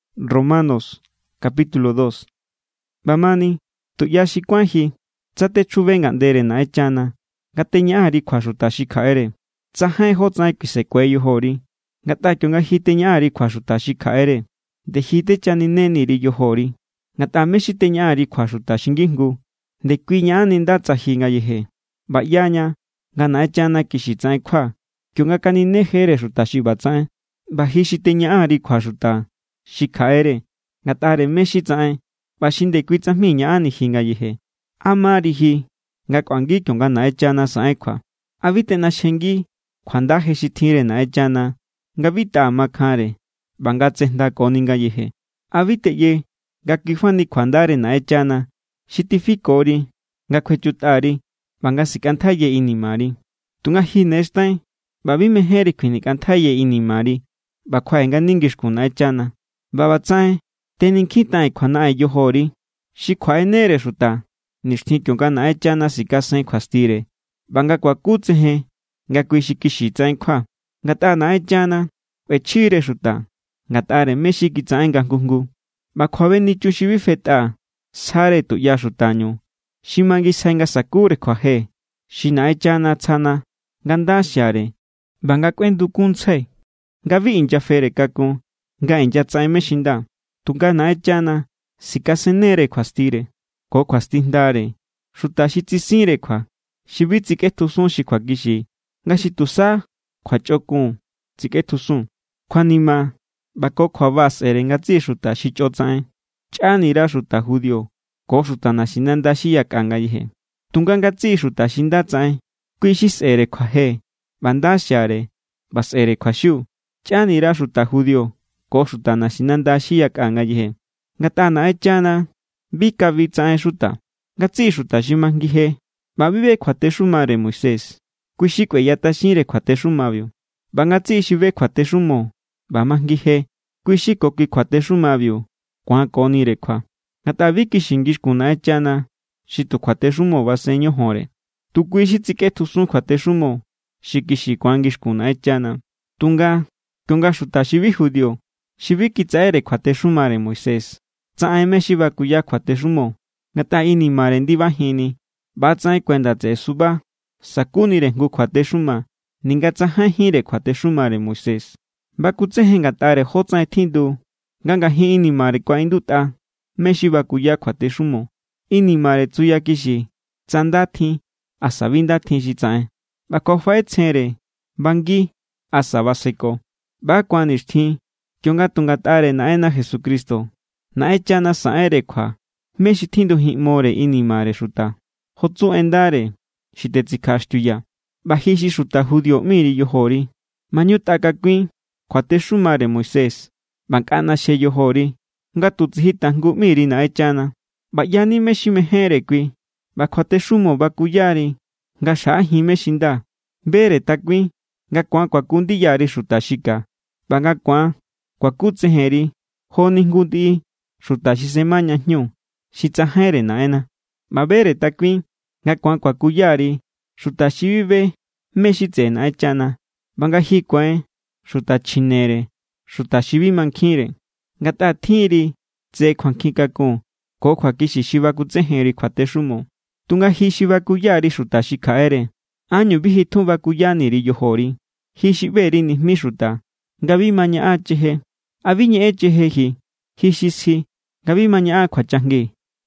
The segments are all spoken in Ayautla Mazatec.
ꞌBa ꞌbamani tuꞌya xi kuáin ji, tsa techjube ngaꞌndere Naꞌenchana nga teñaꞌan_ri kjua xuta xi kjaꞌere, tsajain jótsaꞌen kuisekue yojori. Ngatꞌa kionga ji teñaꞌan_ri kjua xuta xi kjaꞌere, nde ji techaninejeni_ri yojori. Ngatꞌa mé= xi teñaꞌan_ri kjua xuta xi ngijngu, ndekui ñaꞌanni nda tsa ji ngayeje. ꞌBa ꞌyaña nga Naꞌenchana kixi tsaꞌen kjua kionga kaninejere xuta xi ꞌbatsaꞌen. ꞌBa ji xi teñaꞌan_ri kjua xuta xi kjaꞌere ngatꞌare mé= xi tsaꞌen ꞌba xi ndekui tsajmi ñaꞌanni ji ngayeje, ¿a mari ji nga kꞌuangi kionga Naꞌenchana saꞌen kjua? ¿A bi teꞌnaxjengi kjuanda je xi tjinre Naꞌenchana nga bi taꞌa makjanre ꞌba nga tsejndakoni ngayeje? ¿A bi teꞌye nga kuifa ni kjuandare Naꞌenchana xi tifikori nga kjuechutꞌa_ri ꞌba nga sikꞌantjaiya inimari? Tunga ji ne xtain ꞌba bi mejénri kjuinikꞌantjaiye inimari ꞌba kjuaꞌe ngani ngixkun Naꞌenchana. ꞌBa ꞌbatsaꞌen tenikjintaꞌen kjuanaꞌen yojori xi kjuaꞌenere xuta nixtjin kionga Naꞌenchana sikasen kjuastire ꞌba nga kuakutsejen nga kui= xi kixi tsaꞌen kjua. Ngatꞌa Naꞌenchana kꞌuechjire xuta ngatꞌare mé= xi kitsaꞌen nga jngu jngu. ꞌBa kjuabenichun xi bi fetꞌa sjare tuꞌya xutañu xi mangisjai nga sa̱kure kjuaje xi Naꞌenchana tsjana nga nda xiare ꞌba nga kꞌuendukunntsjai nga bi inyafere kakun nga inyatsaꞌen mé= xi nda. Tunga Naꞌenchana sikasennere kjuastire ko kjuastijndare xuta xi tsisinre kjua, xi bi tsikꞌetjusun xi kjuakixi nga xi tusa kjua chꞌokun tsikꞌetjusun. Kjuanima ꞌba ko kjuaba sꞌe̱re ngatsiꞌi xuta xi chꞌo tsaꞌen, chꞌanira xuta judío ko xuta naxinanda xi yakꞌa ngayeje. Tunga ngatsiꞌi xuta xi nda tsaꞌen, kui= xi sꞌe̱re kjuaje ꞌba nda xiare ꞌba sꞌe̱re kjuaxiu, chꞌanira xuta judío ko xuta naxinanda xi yakꞌa ngayeje. Ngatꞌa Naꞌenchana bi kabi tsaꞌen xuta. Ngatsiꞌi xuta xi majngi je ꞌba bi be kjuatexumare Moisés, kui= xi kueyatꞌaxinre kjuatexumabiu. ꞌBa ngatsiꞌi xi be kjuatexumo ꞌba majngi je, kui= xi ko kui kjuatexumabiu ku̱ankonire kjua. Ngatꞌa bi kixi ngixkun Naꞌenchana xi tu kjuatexumo basen ñojonre. Tu kui= xi tsikꞌetjusun kjuatexumo xi kixi ku̱an ngixkun Naꞌenchana. Tunga kionga xuta xi bi judío, xi bi kitsaꞌere kjuatexumare Moisés, tsaꞌen mé= xi bakuya kjuatexumo ngatꞌa inimare ndibajinni, ꞌbatsaꞌen kuenda tseꞌe suba sakunire jngu kjuatexuma, ninga tsajainjínre kjuatexumare Moisés. Bakutsejen ngatꞌare jotsaꞌen tjindu nga ngajin inimare kuaꞌindutꞌa mé= xi bakuya kjuatexumo. Inimare tsuyakixi tsa nda tjin asa bi nda tjin xi tsaꞌen. ꞌBa kjuafaꞌetsjenre bangi asa baseko. ꞌBa= ku̱an nixtjin kionga tu ngatꞌare Naꞌenna Jesucristo Naꞌenchana saꞌenre kjua mé= xi tjindujinꞌmore inimare xuta. Jo tsu en ndare xi tetsikjaꞌaxtiuyaa̱. ꞌBa ji xi xuta judío ꞌmi_ri yojori, maꞌñutꞌa kakuin kjuatexumare Moisés ꞌba nkꞌa ꞌnaxje yojori nga tu tsiji tajngu ꞌmi_ri Naꞌenchana. ꞌBa ꞌyani mé= xi mejénre kui, ꞌba kjuatexumo bakuya=ri nga xjaꞌajin mé= xi nda. Bere takuin nga ku̱an kuaku ndiya_ri xuta xi ka ꞌba nga ku̱an kuakutsejen_ri joni jngu ndiꞌi xuta xi sema ña jñu xi tsajainre Naꞌenna. ꞌBa bere takuin nga ku̱an kuakuya_ri xuta xi bi be mé= xi tseꞌe Naꞌenchana ꞌba nga ji ku̱ain xuta chjinere xuta xi bi mankjinre, ngatꞌa tjinri tse kjuankjin kakun ko kjuakixi xi bakutsejenri kjuatexumo. Tunga ji xi bakuya_ri xuta xi kjaꞌere, ¿ánñu bi ji tjun bakuyani_ri yojori? Ji xi ꞌbe_ri nijmi xuta nga bi ma ñaꞌan cheje, ¿a bi ñeꞌen cheje ji? Ji xi sji nga bi ma ñaꞌan kjuachajngi,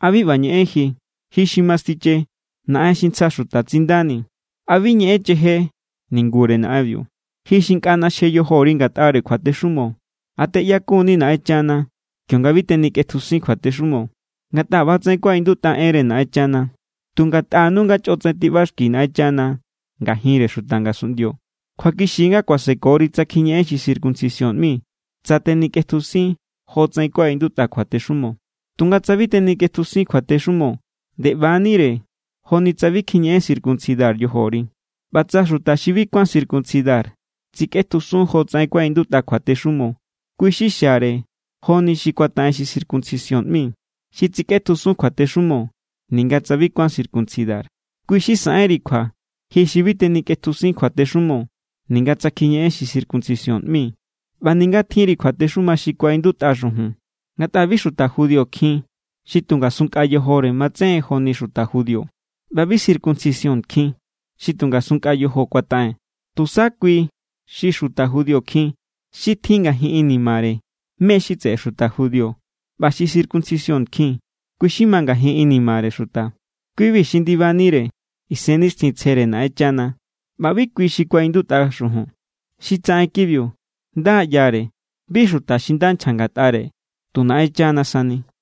¿a bi ꞌba ñeꞌen ji? Ji xi mastiche naꞌen xi ntsja xuta tsindani, ¿a bi ñeꞌen cheje ningure naꞌenbiu? Ji xi nkꞌa ꞌnaxje yojori ngatꞌare kjuatexumo, ¿a teꞌyakun=ni Naꞌenchana kionga bi tenikꞌetjusin kjuatexumo? Ngatꞌa ꞌba=tsaꞌen kuaꞌindutꞌa enre Naꞌenchana: “Tu ngatꞌanu nga chꞌotsaꞌen tiꞌbaxki Naꞌenchana ngajinre xuta ngasunꞌndio.” Kjuakixi= nga kuasekori tsa kjiñeꞌen xi circuncisión ꞌmi tsa tenikꞌetjusin jotsaꞌen kuaꞌindutꞌa kjuatexumo. Tunga tsa bi tenikꞌetjusin kjuatexumo, nde ꞌba=nire jo=ni tsa bi kjiñeꞌen circuncidar yojori. ꞌBa tsa tusa xi bi kuán circuncidar tsikꞌetjusun jotsaꞌen kuaꞌindutꞌa kjuatexumo, kui= xi xiare joni xi kuataꞌen xi circuncisión ꞌmi. Xi tsikꞌetjusun kjuatexumo ninga tsa bi kuán circuncidar, kui= xi saꞌenri kjua ji xi bi tenikꞌetjusin kjuatexumo ninga tsa kjiñeꞌen xi circuncisión ꞌmi ꞌba ninga tjinri kjuatexuma xi kuaꞌindutꞌa xujun. Ngatꞌa bi xuta judío kjin xi tu ngasun nkꞌa yojore matsejen joni xuta judío. ꞌBa bi circuncisión kjin xi tu ngasun nkꞌa yojo kuataꞌen. Tusa kui= xi xuta judío kjin xi tjin ngajin inimare mé= xi tseꞌe xuta judío. ꞌBa xi circuncisión kjin kui= xi ma ngajin inimare xuta. Kui=bi xi ndibanire Isennixtjintsjere Naꞌenchana, ꞌba bi kui= xi kuaꞌindutꞌa xujun. Xi tsaꞌen kibiu nda= ꞌyare, bi xuta xi nda nchja ngatꞌare, tu Naꞌenchana sani.